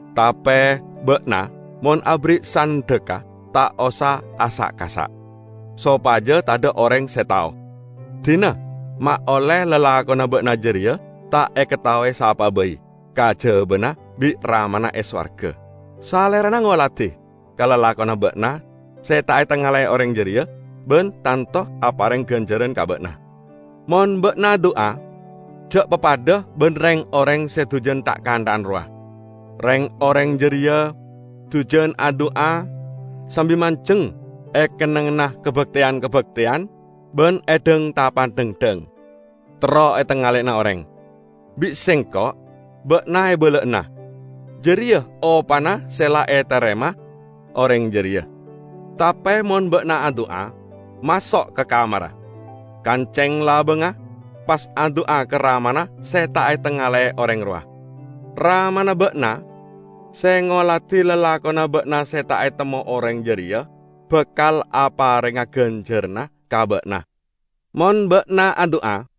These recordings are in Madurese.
Tape ba'na, mon aberri' sandhekka, ta' osa asa'-kasa', sopaja tadha' oreng se tao. Dina ma' olle lalakonna ba'na jareya ta' ekataowe sapa'a bai, kajabana bi' Ramana e sowarga. Salerana ngoladi ka lalakonna ba'na se ta' etangale'e oreng jareya ban tanto apareng ganjaran ka ba'na." "Mon ba'na adu'a, ja' papadha ban reng-oreng se dujan tha'-kantha'an rowa. Reng-oreng jareya dujan adu'a sambi manjeng e kennengnganna kabakteyan-kabakteyan ban e dhang-tapadhangdhang, terro etangaleyana oreng. Bi' Sengko' ba'na ebala'ana: jareya opana se la etarema oreng jareya. Tape mon ba'na adu'a, maso' ka kamarra, kanceng labangnga, pas adu'a ka Ramana se ta' etangale'e oreng rowa. Ramana ba'na se ngoladi lalakonna ba'na se ta' etemmo oreng jareya bakal aparenga ganjaranna ka ba'na. Mon ba'na adu'a,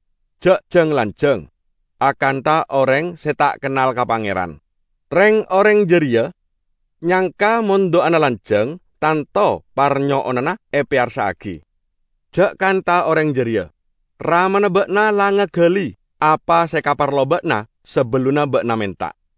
ja' jang-lanjang akantha oreng se ta' kennal ka Pangeran. Reng-oreng jareya nyangka mon du'ana lanjang tanto parnyo'onanna epeyarsa'agi. Ja' kantha oreng jareya. Ramana ba'na la ngagali apa se ekaparlo ba'na, sabellunna ba'na menta.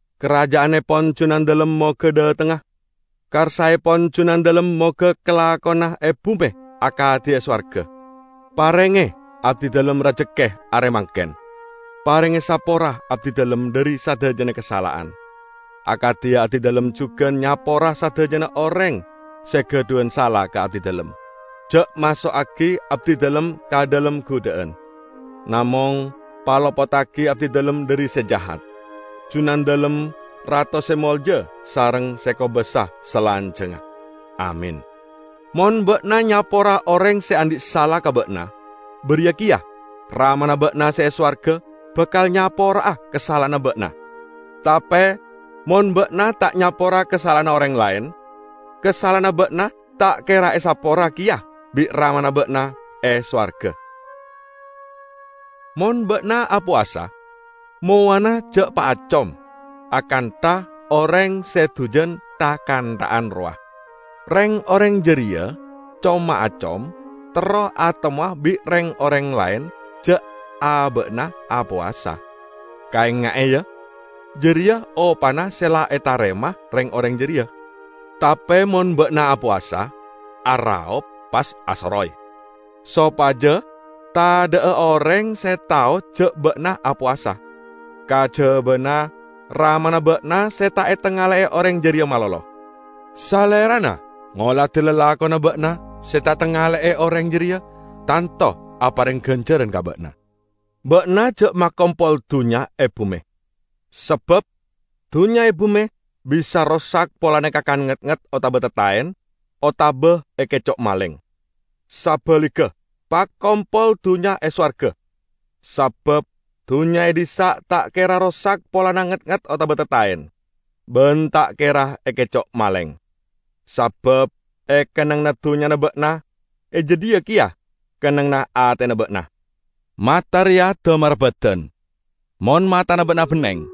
Karaja'annepon Junandalem moga dhatengnga. Karsaepon Junandalem moga kalakona e bume akadi e sowarga. Parenge abdidalem rajekke are mangken. Parenge sapora abdidalem dhari sadajana kasala'an, akadi abdidalem jugan nyapora sadajana oreng se gadhuwan sala ka abdidalem. Ja' maso'agi abdidalem ka dhalem gudha'an, namong palopoddagi abdidalem dhari se jahat. [Junandalem rato se molja sareng se kobasa salanjangnga. Amin.]' Mon ba'na nyapora oreng se andhi' sala ka ba'na, bariya keya Ramana ba'na e sowarga bakal nyapora'a kasala'anna ba'na. Tape mon ba'na ta' nyapora kasala'anna oreng laen, kasala'anna ba'na ta' kera esapora keya bi' Ramana ba'na e sowarga." "Mon ba'na apowasa, mowana ja' paacom akantha oreng se dujan tha'-kantha'an rowa. Reng-oreng jareya com-maacom terro atemmowa bi' reng-oreng laen ja' aba'na apowasa. Kaenga'e, ya, jareya opana se la etarema reng-oreng jareya. Tape mon ba'na apowasa, araop pas asoroy, sopaja tadha'a oreng se tao ja' ba'na apowasa, kajabana Ramana ba'na se ta' etangale'e oreng jareya malolo. Salerana ngoladi lalakonna ba'na se ta' etangale'e oreng jareya tanto apareng ganjaran ka ba'na." "Ba'na ja' makompol dunnya e bume, sabab dunnya e bume bisa rosak polana ekakan ngetnget otaba tattaen otaba ekeco' maleng. Sabaligga, pakompol dunnya e sowarga, sabab dunnya e dhissa' ta' kera rosak polana ngetnget otaba tattaen, ban ta' kera ekeco' maleng. Sabab e kennengnganna dunnyana ba'na, e jadhiya keya kennengnganna atena ba'na!" "Mata reya damarra badan. Mon matana ba'na benneng,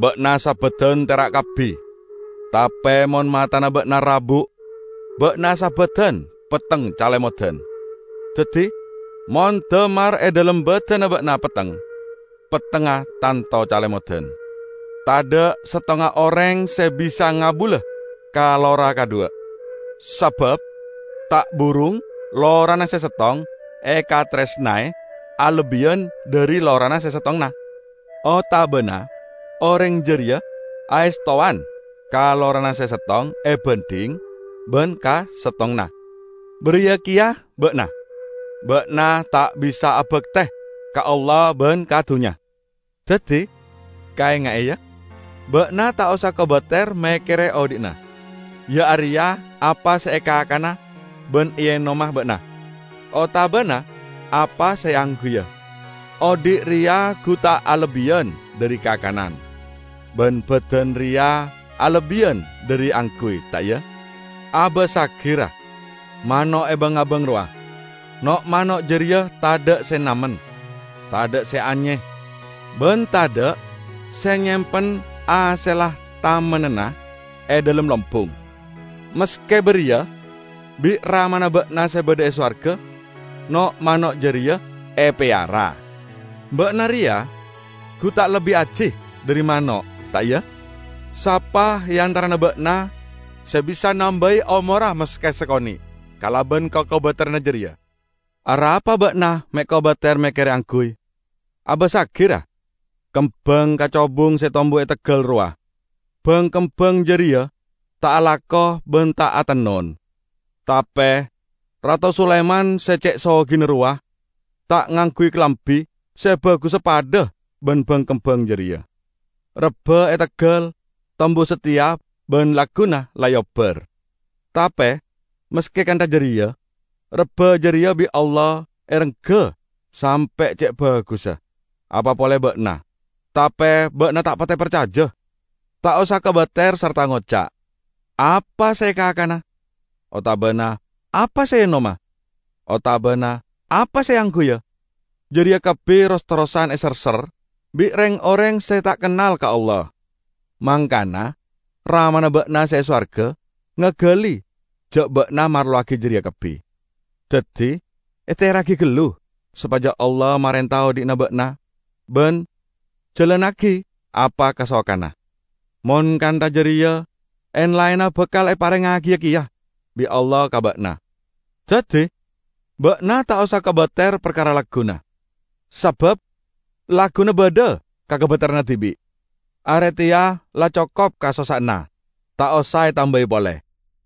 ba'na sabadan tera' kabbi. Tape mon matana ba'na rabuk, ba'na sabadan petteng calemodan. Daddi mon damar e dhalem badanna ba'na petteng, pettengnga tanto calemodan!" "Tadha' settonga oreng se bisa ngabula ka lora kadhuwa. Sabab ta' burung lorana se settong ekataresnae alebbiyan dhari lorana se settonganna. Otabana oreng jareya aestowan ka lorana se settong ebandhing ban ka settonganna. Bariya keya ba'na. Ba'na ta' bisa abakte ka Allah ban ka dunnya. Daddi kaenga'e, ya; ba'na ta' osa kobater mekkere odhi'na, iya areya apa se ekakana ban eenoma ba'na, otabana apa se eangguya. Odhi' reya gu ta' alebbiyan dhari kakanan, ban badan reya alebbiyan dhari angguy, ta' iya? Abassagi, ra, mano' e bang-abang rowa. No'-mano' jareya tadha' se namen, tadha' se anye, ban tadha' se nyempen hasella tamennanna e dhalem lombung. Maske bariya bi' Ramana ba'na se badha e sowarga no'-mano' jareya epeyara! Ba'na reya gu ta' lebbi aji dhari mano', ta' iya? Sapa e antarana ba'na se bisa nambai omorra maske sakone' kalaban kakobateranna jareya? Arapa ba'na me' kobater mekkere angguy? Abassagi, ra, kembang kacobung se tombu e teggal rowa. Bang-kembang jareya ta' alako ban ta' atennon; tape Rato Sulaiman se ce' sogina rowa, ta' ngangguy kalambi se bagussa padha ban bang-kembang jareya! Rebba e teggal tombu sateya ban lagguna la eobbar. Tape maske kantha jareya, rebba jareya bi' Allah erengga sampe' ce' bagussa. Apa pole ba'na! Tape ba'na ta' pate parcaja! Ta' osa kobater sarta ngoca', 'Apa se ekakana' otabana 'apa se eenoma', otabana 'apa se eangguya'? Jareya kabbi ros-terrosan eserser bi' reng-oreng se ta' kennal ka Allah. Mangkana Ramana ba'na se e sowarga ngagali ja' ba'na marlowagi jareya kabbi. Daddi, ehteyarragi gallu sopaja Allah marenta odhi'na ba'na ban jalannagi apa kasokanna. Mon kantha jareya en-laenna bakal eparengngagiya keya bi' Allah ka ba'na. Daddi ba'na ta' osa kobater parkara lagguna, sabab lagguna badha kakobateranna dibi'. Are teya la cokop kasossa'anna, ta' osa etambai pole."